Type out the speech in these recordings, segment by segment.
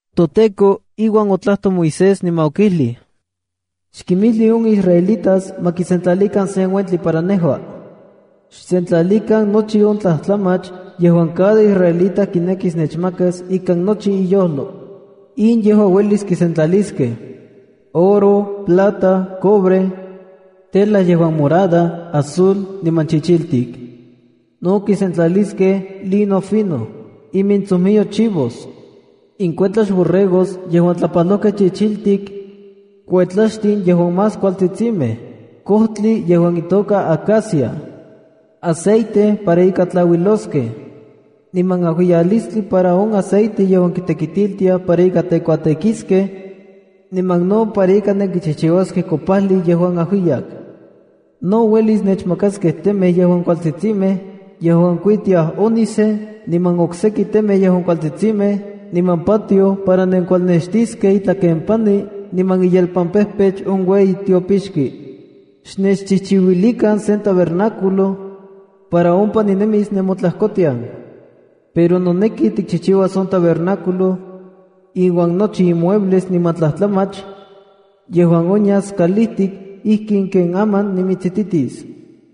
ToTEKO iuan otlajtoj Moisés niman okijlij: “Xkimijli on israelitas ma kisentlalikan sen uentli para nejua. Xsentlalikan nochi on tlajtlamach yejuan cada israelita kinekis nechmakas ikan nochi iyojlo. In yejua uelis kisentlaliskej: oro, plata, cobre, tela yejuan morada, azul, niman chichiltik. No kisentlaliskej: lino fino, imintsojmiyo chivos, inkuetlax borregos yejuan tlapajlojkej chichiltik, kuetlaxtin yejuan más kualtsitsimej, kojtli yejuan itoka acacia, aceite para ika tlauiloskej, niman ajuiyalistli para on aceite yejuan kitekitiltiaj para ika tekuatekiskej ikan aceite niman no para ika nenkichijchiuaskej kopajli yejuan ajuiyak. No uelis nechmakaskej temej yejuan kualtsitsimej yejuan kuitiaj ónice niman okseki temej yejuan kualtsitsimej niman patioj para nenkualnextiskej itlakempani niman iyelpampejpech on ueyi tiopixki. Xnechchijchiuilikan sen tabernáculo1 para ompa ninemis nemotlajkotian. Pero noneki tikchijchiuas on tabernáculo iuan nochi imuebles niman tlajtlamach yejuan onyas kalijtik ijkin ken aman nimitsititis.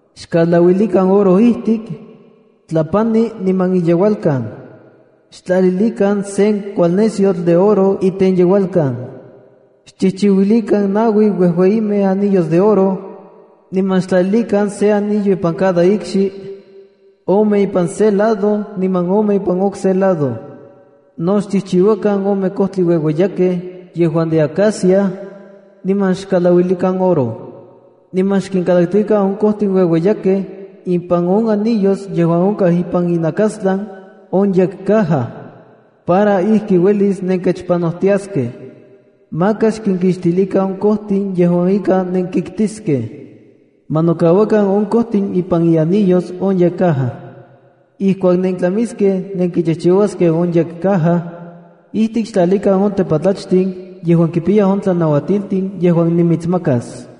Xkalauilikan oro ijtik, tlapani niman iyeualkan. Xtlalilikan sen kualnesyotl de oro itenyeualkan. Xchijchiuilikan naui uejueyimej anillos de oro, niman xtlalilikan sen anillo ipan cada ikxi, ome ipan se lado niman ome ipan on okse lado. No xchijchiuakan ome kojtli ueueyakej yejuan de acacia, niman xkalauilikan oro. Niman xkinkalaktikan on kojtin ueueyakej ipan on anillos yejuan onkaj ipan inakastlan on yekcaja para ijki uelis nenkechpanojtiaskej. Maka xkinkixtilikan on kojtin yejuan ika nenkiktiskej. Ma nokauakan on kojtin ipan ianillos on yekcaja. Ijkuak nentlamiskej nenkichijchiuaskej on yekcaja, ijtik xtlalikan on tepatlachtin yejuan kipiyaj on tlanauatiltin yejuan nimitsmakas.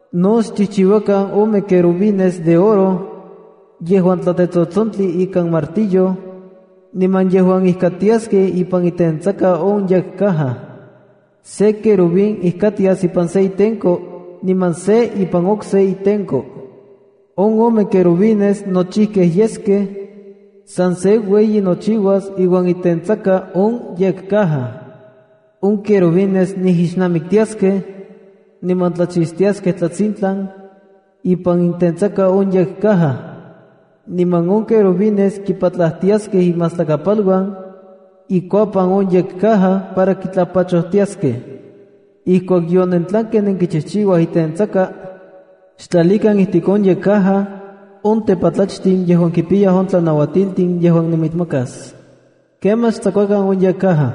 No xchijchiuakan ome querubines de oro yejuan tlatetsotsontli ikan martillo, niman yejuan ijkatiaskej ipan itentsaka on yekcaja. Se querubín ijkatias ipan se itenko niman se ipan okse itenko. On ome querubines nochijkej yeskej san se ueyi nochiuas iuan itentsaka on yekcaja. On querubines nijixnamiktiaskej niman tlachixtiaskej tlatsintlan ipan itentsaka on yekcaja. Niman on querubines kipatlajtiaskej iminmastlakapal ikuapan on yekcaja para kitlapachojtiaskej. Ijkuak yonentlankej nenkichijchiuaj itentsaka, xtlalikan ijtik on yekcaja on tepatlachtin yejuan kipiyaj on tlanauatiltin yejuan nimitsmakas. Kemaj xtsakuakan on yekcaja.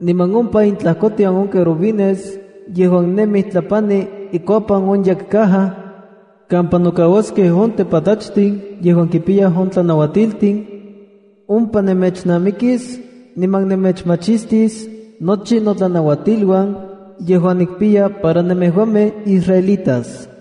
Niman ompa intlajkotian on querubines yejuan nemij tlapani ikuapan on yekcaja kampa nokauaskej on tepatlachtin yejuan kipiyaj on tlanauatiltin, ompa nemechnamikis niman nemechmachistis nochi notlanauatiluan yejuan nikpiya para nemejuamej israelitas.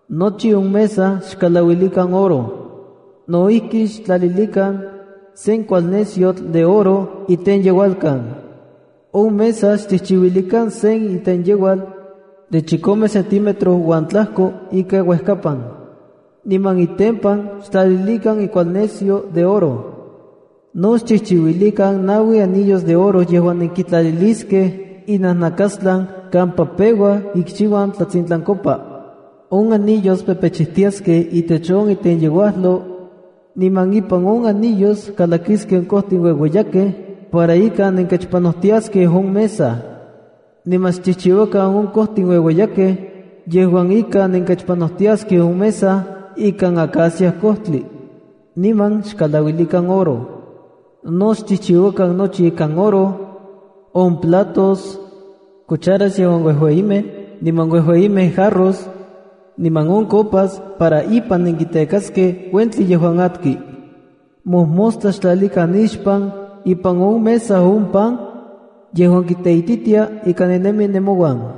Nochi on mesa xkalauilikan oro. No ijki, xtlalilikan sen kualnesyotl de oro itenyeualkan. On mesa xchijchiuilikan sen itenyeual de chikome centímetro uan tlajko ika uejkapan, niman itempan xtlalilikan ikualnesyo de oro. No xchijchiuilikan naui anillos de oro yejuan nenkitlaliliskej inajnakastlan kampa peuaj ikxiuan tlatsintlankopa. On anillos pepechijtiaskej itech on itenyeuajlo, niman ipan on anillos kalakiskej on kojtin ueueyakej para ika nenkechpanojtiaskej on mesa. Niman xchijchiuakan on kojtin ueueyakej yejuan ika nenkechpanojtiaskej on mesa ikan acacia kojtli, niman xkalauilikan oro. No xchijchiuakan nochi ikan oro: on platos, cucharas yejuan uejueyimej, niman uejueyimej jarros, niman on copas para ipan nenkitekaskej uentli yejuan atki. Mojmostla xtlalikan nixpan ipan on mesa on pan tlatiochijtli yejuan kiteititia ika ninemi nemouan.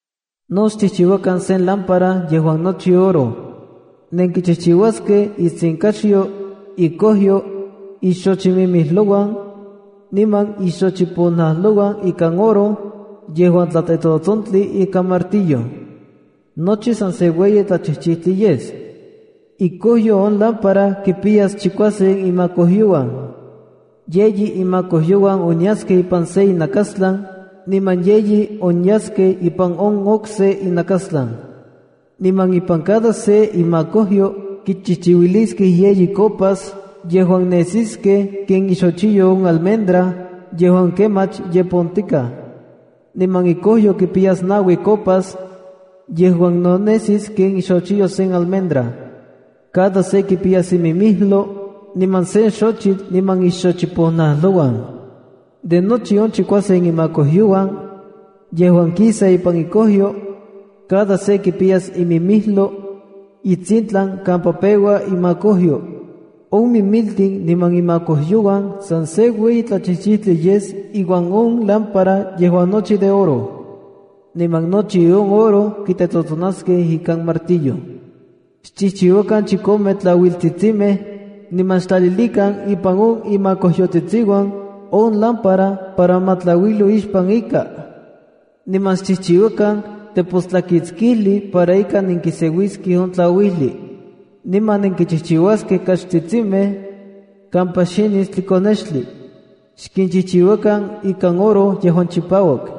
’No xchijchiuakan sen lámpara yejuan nochi oro. Nenkichijchiuaskej itsinkaxyo, ikojyo, ixochimimijlouan niman ixochiponajlouan ikan oro yejuan tlatetsotsontli ika martillo. Nochi san se ueyi tlachijchijtli yes. Ikojyo on lámpara kipiyas chikuasen imakojyouan. Yeyi imakojyouan onyaskej ipan se inakastlan niman yeyi onyaskej ipan on okse inakastlan. Niman ipan cada se imakojyo kichijchiuiliskej yeyi copas yejuan nesiskej ken ixochiyo on almendra yejuan kemach ye pontikaj. Niman ikojyo kipiyas naui copas yejuan no nesis ken ixochiyo sen almendra. Cada se kipiyas imimijlo niman sen xochitl niman ixochiponajlouan. De nochi on chikuasen imakojyouan yejuan kisa ipan ikojyo, cada se kipiyas imimijlo itsintlan kampa peua imakojyo. On mimiltin niman imakojyouan san se ueyi tlajchijchijtli yes iuan on lámpara yejuan nochi de oro. Niman nochi on oro kitetsotsonaskej ika martillo. ’Xchijchiuakan chikome tlauiltsitsimej niman xtlalilikan ipan on imakojyotsitsiuan on lámpara para ma tlauilo ixpan ika. Niman xchijchiuakan tepostlakitskijli para ika nenkiseuiskej on tlauijli, niman nenkichijchiuaskej kaxtsitsimej kampa xinis tlikonextli. Xkinchijchiuakan ikan oro yejuan chipauak.